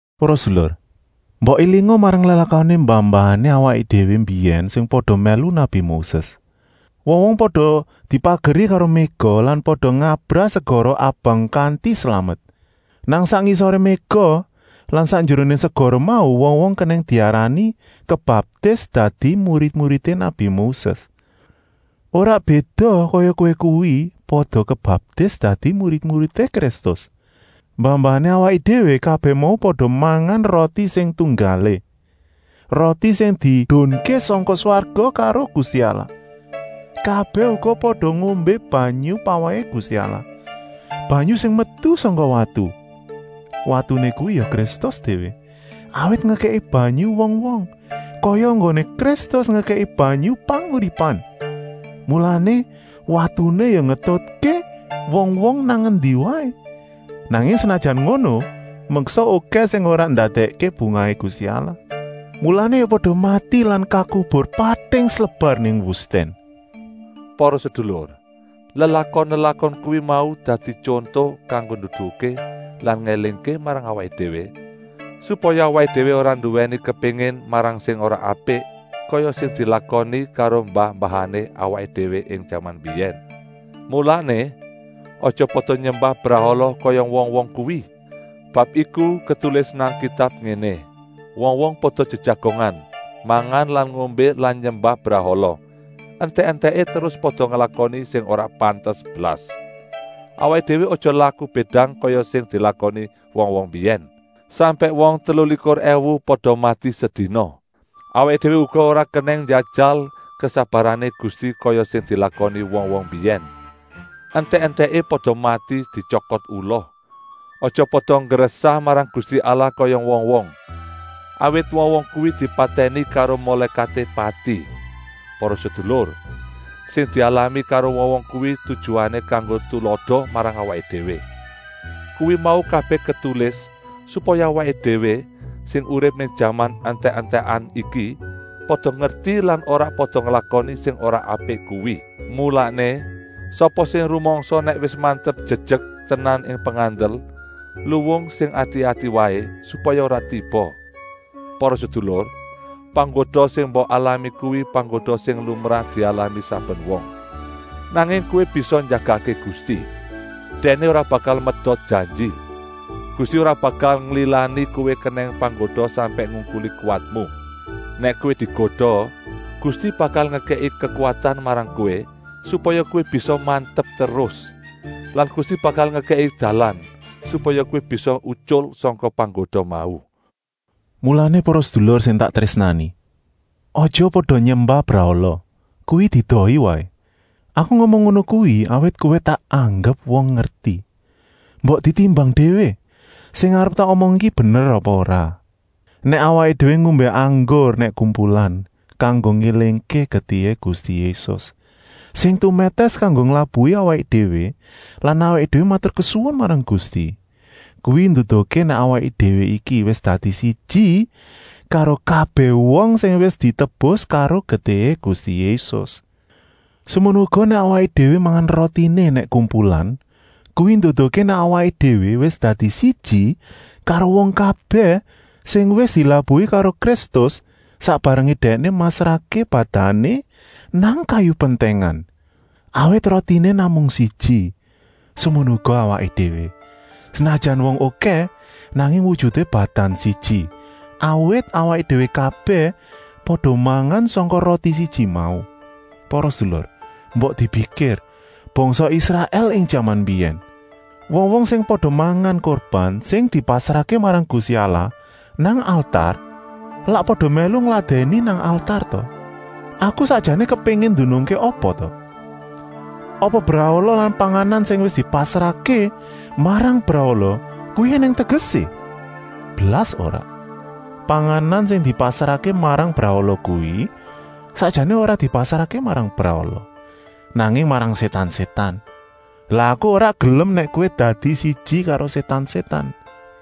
Para sedulur, mbok élinga marang lelakoné mbah-mbahané awaké déwé mbiyèn sing pada mèlu nabi Moses. Wong-wong pada dipageri karo méga lan pada ngabrah segara Abang kanti slamet. Nang sak ngisoré méga lan sakjeroné segara mau wong-wong kenèng diarani kebaptis dadi murid-muridé nabi Moses, ora béda kaya kowé kuwi pada kebaptis dadi murid-muridé Kristus. Mbah-mbahané awaké déwé kabèh mau pada mangan roti sing tunggalé, roti sing diedunké sangka swarga karo Gusti Allah. Kabèh uga pada ngombé banyu pawèhé Gusti Allah, banyu sing metu sangka watu. Watuné kuwi ya Kristus déwé, awit ngekèki banyu wong-wong, kaya enggoné Kristus ngekèki banyu panguripan. Mulané watuné ya ngetutké wong-wong nang endi waé. Nanging senajan ngono, meksa okèh sing ora ndadèkké bungahé Gusti Allah, mulané ya pada mati lan kakubur pating slebar nang wustèn. Para sedulur, lelakon-lelakon kuwi mau dadi tyonto kanggo nduduhké lan ngélingké marang awaké déwé, supaya awaké déwé ora nduwèni kepéngin marang sing ora apik, kaya sing dilakoni karo mbah-mbahané awaké déwé ing jaman mbiyèn. Mulané, aja pada nyembah brahala kaya wong-wong kuwi. Bab iku ketulis nang Kitab ngéné: “Wong-wong pada jejagongan, mangan lan ngombé lan nyembah brahala, entèk-entèké terus pada nglakoni sing ora pantes blas.” Awaké déwé aja laku bédang kaya sing dilakoni wong-wong mbiyèn, sampèk wong telulikur èwu pada mati sedina. Awaké déwé uga ora kenèng njajal kesabarané Gusti kaya sing dilakoni wong-wong mbiyèn; entèk-entèké pada mati dityokot ula. Aja pada nggresah marang Gusti Allah kaya wong-wong, awit wong-wong kuwi dipatèni karo Mulékaté Pati. Para sedulur, sing dialami karo wong-wong kuwi tujuané kanggo tulada marang awaké déwé. Kuwi mau kabèh ketulis, supaya awaké déwé, sing urip ing jaman entèk-entèkan iki, pada ngerti lan ora pada nglakoni sing ora apik kuwi. Mulané, sapa sing rumangsa nèk wis mantep jejek tenan ing pengandel, luwung sing ati-ati waé, supaya ora tiba. Para sedulur, panggoda sing mbok alami kuwi panggoda sing lumrah dialami saben wong. Nanging kowé bisa njagakké Gusti, Dèkné ora bakal medot janji. Gusti ora bakal nglilani kowé kenèng panggoda sampèk ngungkuli kuwatmu. Nèk kowé digoda, Gusti bakal ngekèki kekuwatan marang kowé, supaya kowé bisa mantep terus. Lan Gusti bakal ngekèki dalan, supaya kowé bisa utyul sangka panggoda mau. Mulané para sedulur sing tak trésnani, aja pada nyembah brahala, kuwi diedohi waé. Aku ngomong ngono kuwi, awit kowé tak anggep wong ngerti. Mbok ditimbang déwé, sing arep tak omong iki bener apa ora. Nèk awaké déwé ngombé anggur nèk kumpulan, kanggo ngélingké getihé Gusti Yésus, sing tumètès kanggo nglabuhi awaké déwé lan awaké déwé maturkesuwun marang Gusti, kuwi nduduhké nèk awaké déwé iki wis dadi siji karo kabèh wong sing wis ditebus karo getihé Gusti Yésus. Semono uga nèk awaké déwé mangan rotiné nèk kumpulan, kuwi nduduhké nèk awaké déwé wis dadi siji karo wong kabèh sing wis dilabuhi karo Kristus sak barengé Dèkné masrahké badané nang kayu pentèngan. Awit rotiné namung siji, semono uga awaké déwé, senajan wong okèh, nanging wujuté badan siji, awit awaké déwé kabèh pada mangan sangka roti siji mau. Para sedulur, mbok dipikir bangsa Israèl ing jaman mbiyèn. Wong-wong sing pada mangan kurban sing dipasrahké marang Gusti Allah nang altar lak pada mèlu ngladèni nang altar ta. Aku sakjané kepéngin ndunungké apa ta? Apa brahala lan panganan sing wis dipasrahké marang brahala kuwi ènèng tegesé? Blas ora! Panganan sing dipasrahké marang brahala kuwi sakjané ora dipasrahké marang brahala, nanging marang sétan-sétan. Lan aku ora gelem nèk kowé dadi siji karo sétan-sétan.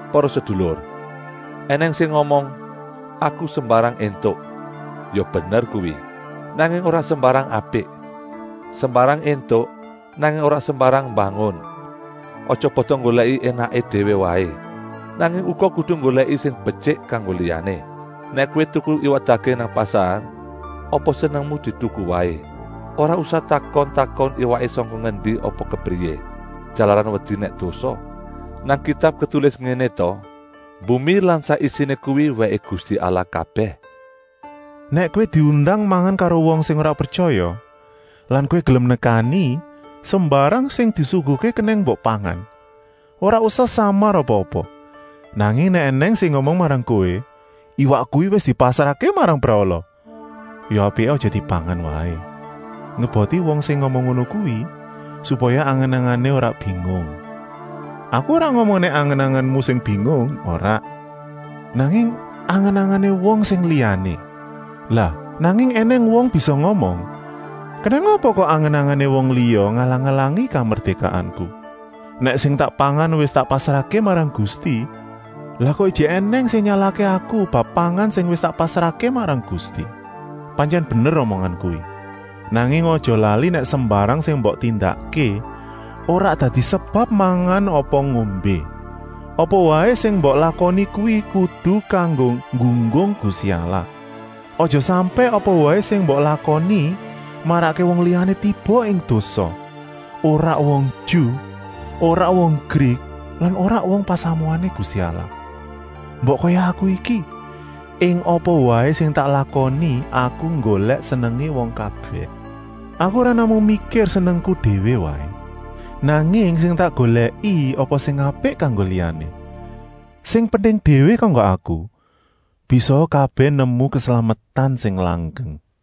Para sedulur, ènèng sing ngomong: “Aku sembarang éntuk.” Ya bener kuwi, nanging ora sembarang apik. Sembarang éntuk, nanging ora sembarang mbangun. Aja pada nggolèki énaké déwé waé, nanging uga kudu nggolèki sing betyik kanggo liyané. Nèk kowé tuku iwak daging nang pasar, apa senengmu dituku waé, ora usah takon-takon iwaké sangka ngendi apa kepriyé, jalaran wedi nèk dosa. Nang Kitab ketulis ngéné ta: “Bumi lan sak isiné kuwi wèké Gusti Allah kabèh.” Nèk kowé diundang mangan karo wong sing ora pretyaya lan kowé gelem nekani, sembarang sing disuguhké kenèng mbok pangan. Ora usah samar apa-apa. Nanging nèk ènèng sing ngomong marang kowé: “Iwak kuwi wis dipasrahké marang brahala,” ya apiké aja dipangan waé, ngeboti wong sing ngomong ngono kuwi, supaya angen-angené ora bingung. Aku ora ngomong nèk angen-angenmu sing bingung, ora, nanging angen-angené wong sing liyané. Lah nanging ènèng wong bisa ngomong: “Kenèng apa kok angen-angené wong liya ngalang-alangi kamerdékaanku? Nèk sing tak pangan wis tak pasrahké marang Gusti, lah kok ijik ènèng sing nyalahké aku bab pangan sing wis tak pasrahké marang Gusti?” Pantyèn bener omongan kuwi, nanging aja lali nèk sembarang sing mbok tindakké, ora dadi sebab mangan apa ngombé, apa waé sing mbok lakoni kuwi kudu kanggo nggunggung Gusti Allah. Aja sampèk apa waé sing mbok lakoni marakké wong liyané tiba ing dosa, ora wong Ju, ora wong Grik lan ora wong pasamuané Gusti Allah. Mbok kaya aku iki: ing apa waé sing tak lakoni aku nggolèk senengé wong kabèh. Aku ora namung mikir senengku déwé waé, nanging sing tak golèki apa sing apik kanggo liyané. Sing penting déwé kanggo aku, bisaa kabèh nemu keslametan sing langgeng.